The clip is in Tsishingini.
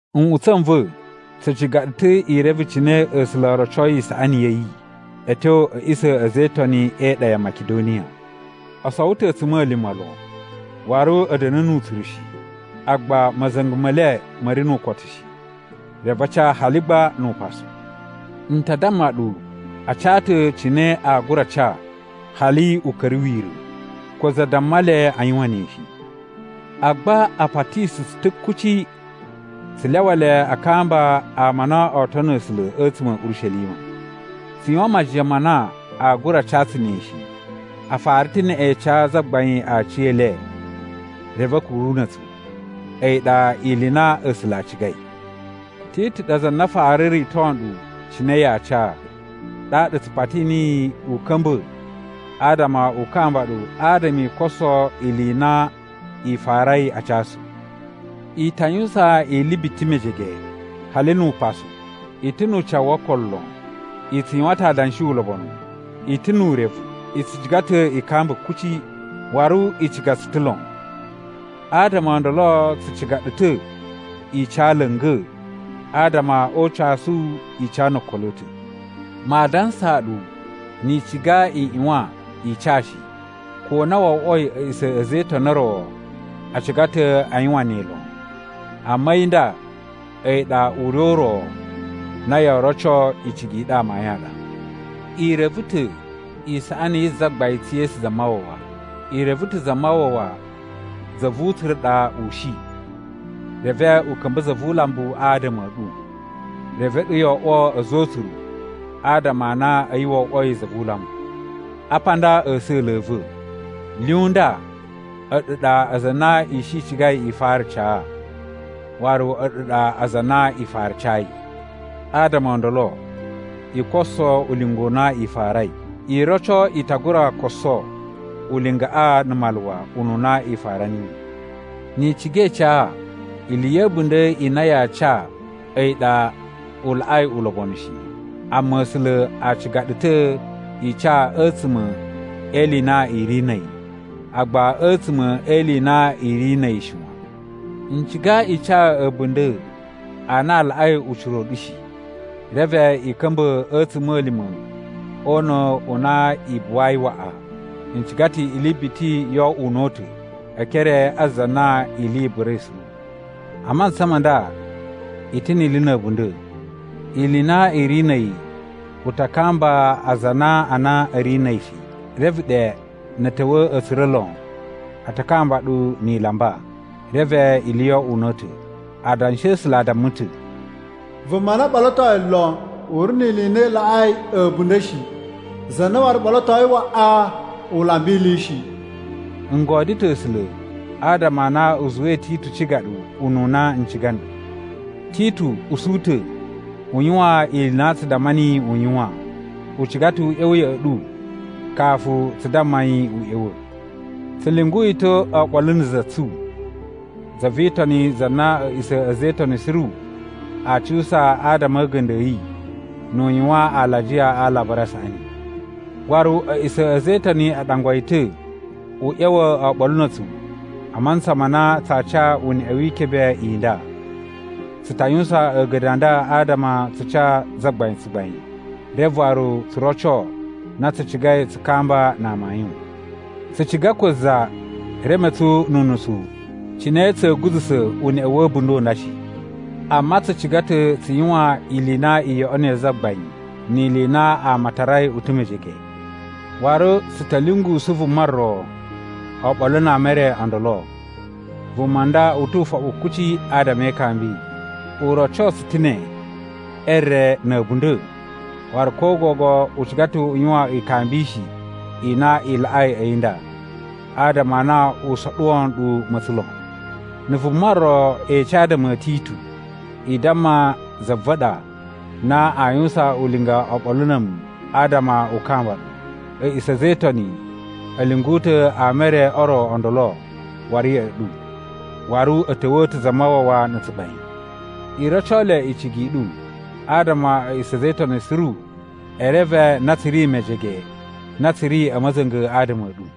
Nꞌutsa̱ n va̱, tsu ciga ɗu ta̱ i reve cine A̱sula̱ o rocoi isaꞌani ya̱ yi a̱ tyo a̱ a̱ꞌisa̱ a̱ a̱za̱ e Itoni e iɗa ya Makidoniya. O sowo ta̱ a̱tsuma̱lima̱ lon, waru a̱ da̱na̱ nu utsuru shi, agba ma̱za̱nga̱ me le ma̱ ri nu ukotu shi, reve a ca hali gba nu upasu. N ta damma ɗu a ca ta̱ cine aa gura ca hali u ka̱ra̱ wira̱. Ko za damma le a yuwan ne shi. Agba a patishi tsu ta̱ kuci tsu lyawa le a kamba ama a na oo tono A̱sula̱ a̱tsuma̱ a̱ Urishelima. Tsu yuwan majiyan ma na aa gura ca tsu ne shi! A fara ta̱ neꞌen ca Zagbain aciyele reve a̱ kuru na̱ a̱tsu. A̱yi ɗa ili i na A̱sula̱ a cigai. Titu ɗa za na fara rito nɗu cine yaa ca, ɗaɗa tsu pati niyi u ka̱mba̱ adama u kamba ɗu adama i koso ili i na i farai a casu. I ta yuwusan ili biti mejege, hali nu upasu: I ta̱ nu ucawu wo okolo lon. I tsu yuwan ta̱ adanshi ulobonu. I ta̱ nu urevu. I tsu ciga ta̱ i kamba kuci. Waru i ciga tsu ta̱ lon. Adama o ndolo tsu ciga ɗu ta̱ i ca la̱nga̱, adama o ucasu i ca no okolo a̱ ta̱. Maa dansaa ɗu ni i ciga i ꞌyuwan i ca shi, ko na wo oꞌwoi a̱ꞌisa̱ a̱ a̱za̱ e Itoni o ro a ciga ta̱ a yuwan ne lon. Amma a̱yi nda a̱yi ɗa ure u ro na yoo roco icigi i ɗu amayun a ɗa. I reve ta̱ isaꞌani yi Zagbain tsu Yesu Zamawawa. I reve ta̱ Zamawawa za vu utsuru ɗa u shi, reve u ka̱mba̱ za vu ulambu adama a̱ ɗu, reve a̱ɗu yo oꞌwo a̱za̱ o utsuru adama a na a̱yi wo oꞌwoi za vu ulambu. Apa a nda a̱sa̱la̱ a̱ va̱: Lyun nda a̱ɗu ɗa aza a na i shi i cigai i fara ca, waru a̱ɗu ɗa aza a na i fara cayi. Adama o ndolo i koso ulinga u na i farai. I roco i ta gura koso ulingaꞌa na̱ maluwa ununa i fara niyi. Ni i ciga i ca, ili ya̱ a̱bunda̱ i na yaa ca a̱yi ɗa u laꞌai ulobonu shi. Amma A̱sula̱ a ciga ɗu ta̱ i ca a̱tsuma̱ e ili i na i ri na̱ a̱yi, agba a̱tsuma̱ e ili i na i ri na̱ a̱yi shi wan. N ciga i ca a̱bunda̱ a na a laꞌai ucira u ɗu shi, reve i ka̱mba̱ a̱ a̱tsuma̱lima̱ o una̱ u na i buwayi waꞌa. N ciga ta̱ ili biti yo oꞌwo una̱ta̱ e ekere a za na ili i burai suru. A mantsa ma nda i ta̱ ni ili na̱ a̱bunda̱. Ili i na i ri na̱ a̱yi u ta kamba aza a na a na a̱ ri na̱ a̱yi shi. Reve ɗe, na̱ a̱ ta̱wa̱ a̱ tsura̱ lon, a ta kamba ɗu ni i lamba, reve ili yo oꞌwo una̱ta̱. Adanshi a̱ A̱sula̱ a damma ta̱, “Vuma na ɓolotoi lon, u ri ni ili i na i laꞌai a̱bunda̱ shi. Za na waru ɓolotoi waꞌa, u lamba ili shi.” N godyo ta̱ A̱sula̱ adama a na u zuwai Titu ciga ɗu ununa n ciga nɗu. Titu usu ta̱ u yuwan ili i na tsu damma niyi u yuwan. U ciga ta̱ u ꞌya̱wa̱ ya̱ꞌa̱ ɗu kafu tsu damma yi u ꞌya̱wa̱. Tsu lyungu yi ta̱ oɓolo na̱ za tsu, za vi Itoni za na a̱ꞌisa̱ a̱ a̱za̱ e Itoni suru aa cuwusa adama a̱ a̱ga̱nda̱ a̱ yi nu u yuwan alajiya a Alabari a Saꞌani. Waru, a̱ꞌisa̱ a̱ a̱za̱ e Itoni a ɗangwa yi ta̱ u ꞌya̱wa̱ oɓolo na̱ a̱tsu a mantsa ma na tsaa ca uneꞌe wi ikebe i nda. Tsu ta yuwusan a̱ga̱nda̱ a nda adama tsu ca Zagbain tsugbain, reve waru tsu roco na tsu cigai tsu kamba na amayun. Tsu ciga ko za reme tsu nu unusu cine tsa̱a̱ guza̱sa̱ uneꞌe wa̱ a̱bunda̱ u nda shi. Amma tsu ciga ta̱ tsu yuwan ili i na i yoꞌonoi Zagbain ni ili i na ama a tarai u ta̱ mejege. Waru, tsu ta̱ lyungusu vuma ro oɓolo na ama e re o ndolo. Vuma nda u tu ufoɓu kuci adama e ikambi. U roco tsu ta̱ ne e re na̱ a̱bunda̱ waru ko gogo u ciga ta̱ u yuwan ikambishi i na i laꞌai a̱yi nda, adama a na u soɗuwo nɗu ma̱tsa̱n lon. Na̱ vuma ro ece adama a̱ Titu, i damma za va̱ ɗa na aa yuwusan ulinga oɓolo na̱ a̱mu adama u kamba ɗu. A̱ꞌisa̱ a̱ a̱za̱ e Itoni a̱ lyungu ta̱ ama e re o ro o ndolo waru ya̱ꞌa̱ ɗu, waru a̱ ta̱wa̱a̱ ta̱ Zamawawa na̱ tsugbain. I roco le icigi i ɗu, adama a̱ꞌisa̱ a̱ a̱za̱ e Itoni suru e reve na tsu ri mejege na tsu ri a̱ ma̱za̱nga̱ adama a̱ ɗu.